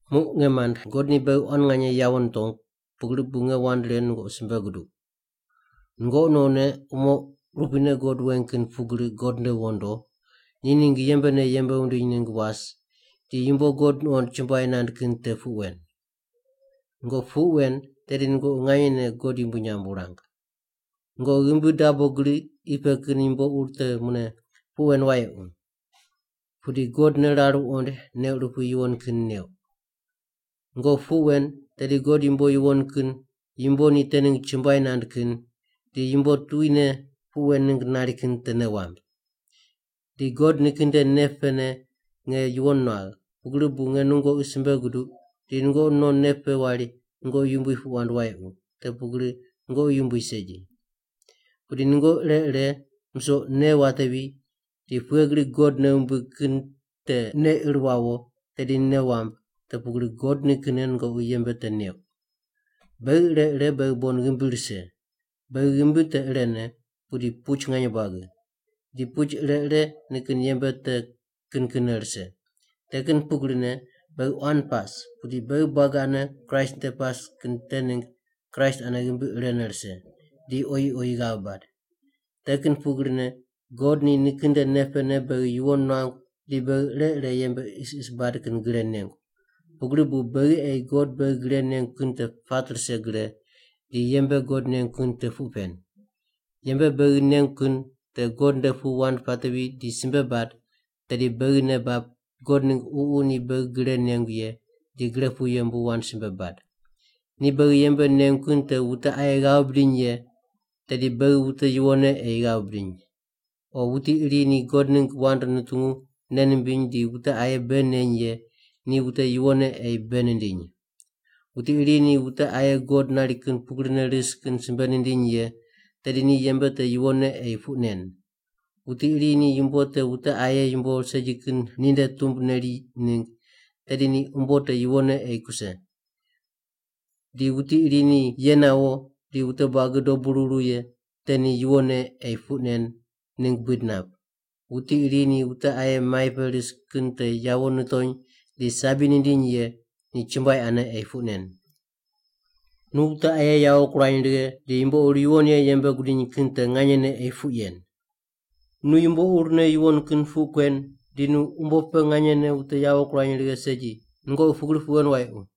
Muq nge mand, God ni beghi quan nganye yawo nitongu, pugri bu nge wand ren nungoqi simbe guduq. Nungoqi nonne umo urupuine God weng kin pugri God nde wondo, ni ningg yembene yembe wundiny ningg was di yumbo God nuqond chumbuai nand kin te puq wen. Nungoqi puq wen tedi nungoqi nganyene God yumbui nyamb wurang. Nungoqi ghimbi dabo gri qi pe kin yumbo ur te mune puq wen wayequ. Pudi God ne rar wuqoind nei urupui yuwon kin neuq. Nungoqi puq wen tedi God yumbo yuwon kin, yumbo ni te ningg chumbuai nand kin, di yumbo tuquine puq wen ningg nari kin te nei wamb. Di God nikin nde nei pene nge yuwon nuagh, pugri bu nge nungoqi simbe guduq di nungoqi non nei pe wari nungoqi yumbui puq wand wayequ, te pugri nungoqi yumbui segi. Pudi nungoqi ire ire musoq nei watevi di pughe gri God nei wumbig kin te nei ir wawo tedi nei wamb te pugri God nikinne nungoqi yembe te neuq. Beghi ire ire beghi bon ghimbi rise. Beghi ghimbi te irene, pudi puch nganye buagi. Di puch ire ire nikin yembe te kin kinne rise. Te kin pugrine beghi quan pas, pudi beghi buagi ane Kraist nde pas kin te ningg Kraist ane ghimbi irene rise, di oyi oyi ghav bad. Te kin pugrine God ni nikin nde nei pene beghi yuwon nuangu di beghi ire ire yembe isis bad kin gre nengu. Pugri bu beghi ei God beghi gre nengu kin te pat rise gre, di yembe God nengu kin te puq pen. Yembe beghi nengu kin te God nde pu wand pateri di simbe bad, tedi beghi nei bab God ningg Ququ ni beghi gre nengu ye di gre pu yembu wand simbe bad. Ni beghi yembe nengu kin te wute aye ghav bidiny ye, tedi beghi wute yuwonne ei ghav bidiny. O wuti iri ni God ningg wand nutungu nei nimbiny di wute aye bei neny ye ni wute yuwonne ei bei nindiny. Wuti iri ni wute aye God nari kin pugrine ris kin simbe nindiny ye, tedi ni yembe te yuwonne ei puq nen. Wuti iri ni yumbo te wute aye yumbo segi kin ninde tumb neri ningg, tedi ni umbo te yuwonne ei kuse. Di wuti iri ni ye nawo di wute buagi dobu ruru ye te ni yuwonne ei puq nen ningg buid nap. Wuti iri ni wute aye mai pe ris kin te yawo nitony di sabi nindiny ye, ni chumbuai ane ei puq nen. Nu wute aye yawo kurany righe di yumbo ur yuwon ye yembe gudiny kin te nganyene ei puq yen. Nu yumbo urne yuwon kin puq kuen di nu umbo pe nganyene wute yawo kurany righe segi, nungoqi pugri puq wen wayequ.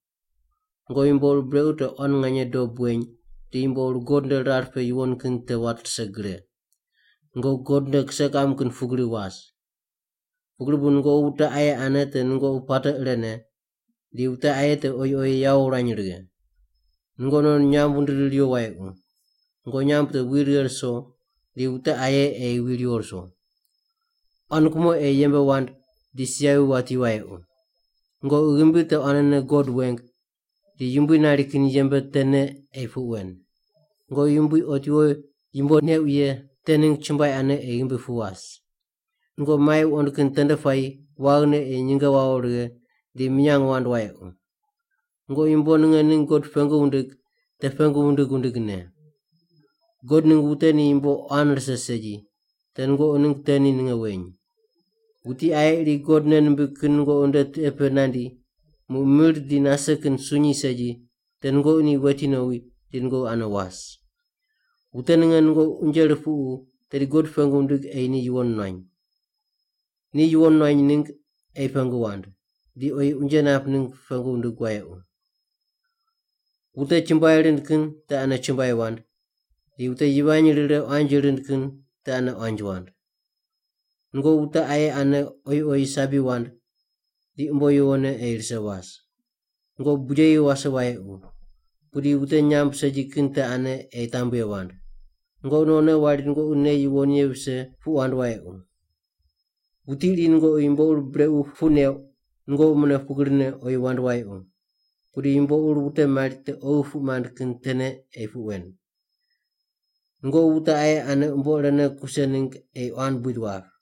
Nungoqi yumbo ur brequ te quan nganye dob weny di yumbo ur God nde rar pe yuwon kin te wat rise gre. Nungoqi God nde kise kiqam kin pugri was. Pugri bu nungoqi wute aye ane te nungoqi puate irene, di wute aye te oyi oyi yawo wurany righe. Nungoqi non nyamb wundiri riwo wayequ. Nungoqi nyamb te wi righe ruso di wute aye ei wi riwo ruso. Quan kumo ei yembe wand di si yavi wati wayequ. Nungoqi ghimbi te quanene God weng di Yumbui nari kin yembe tene ei puq wen. Nungoqi Yumbui otiwo yumbo neuq ye te ningg chumbuai ane ei ghimbi pu was. Nungoqi mai wuqond kin tende puayi waghine ei nyinge wawo righe di minyang wand wayequ. Nungoqi yumbo ninge ningg God pengu wundig, te pengu wundig wundigne. God ningg wute ni yumbo quan rise segi, te nungoqi ningg te ni ninge weny. Wuti aye iri God nei nimbig kin nungoqi nde tiqe pe nandi, muq mir di nase kin sunyi segi, te nungoqi ni weti nowi di nungoqi ane was. Wute ninge nungoqi unje rupuqu tedi God pengu wundig ei ni yuwon nuany. Ni yuwon nuany ningg ei pengu wand, di oyi unje nap ningg pengu wundig wayequ. Wute chumbuai rind kin te ane chumbuai wand, di wute yivany rire quanji rind kin te ane quanji wand. Nungoqi wute aye ane oyi oyi sabi wand di umbo yuwonne ei rise was. Nungoqi bujeyi wase wayequ. Pudi wute nyamb segi kin te ane ei tambye wand. Nungoqi nonne wari nungoqi nei yuwon ye vise puq wand wayequ. Wuti iri nungoqi yumbo ur brequ puq neuq, nungoqi mune pugrine oyi wand wayequ. Pudi yumbo ur wute mari te oghi puq mand kin tene ei puq wen. Nungoqi wute aye ane umbo irene kuse ningg ei quan buid wap.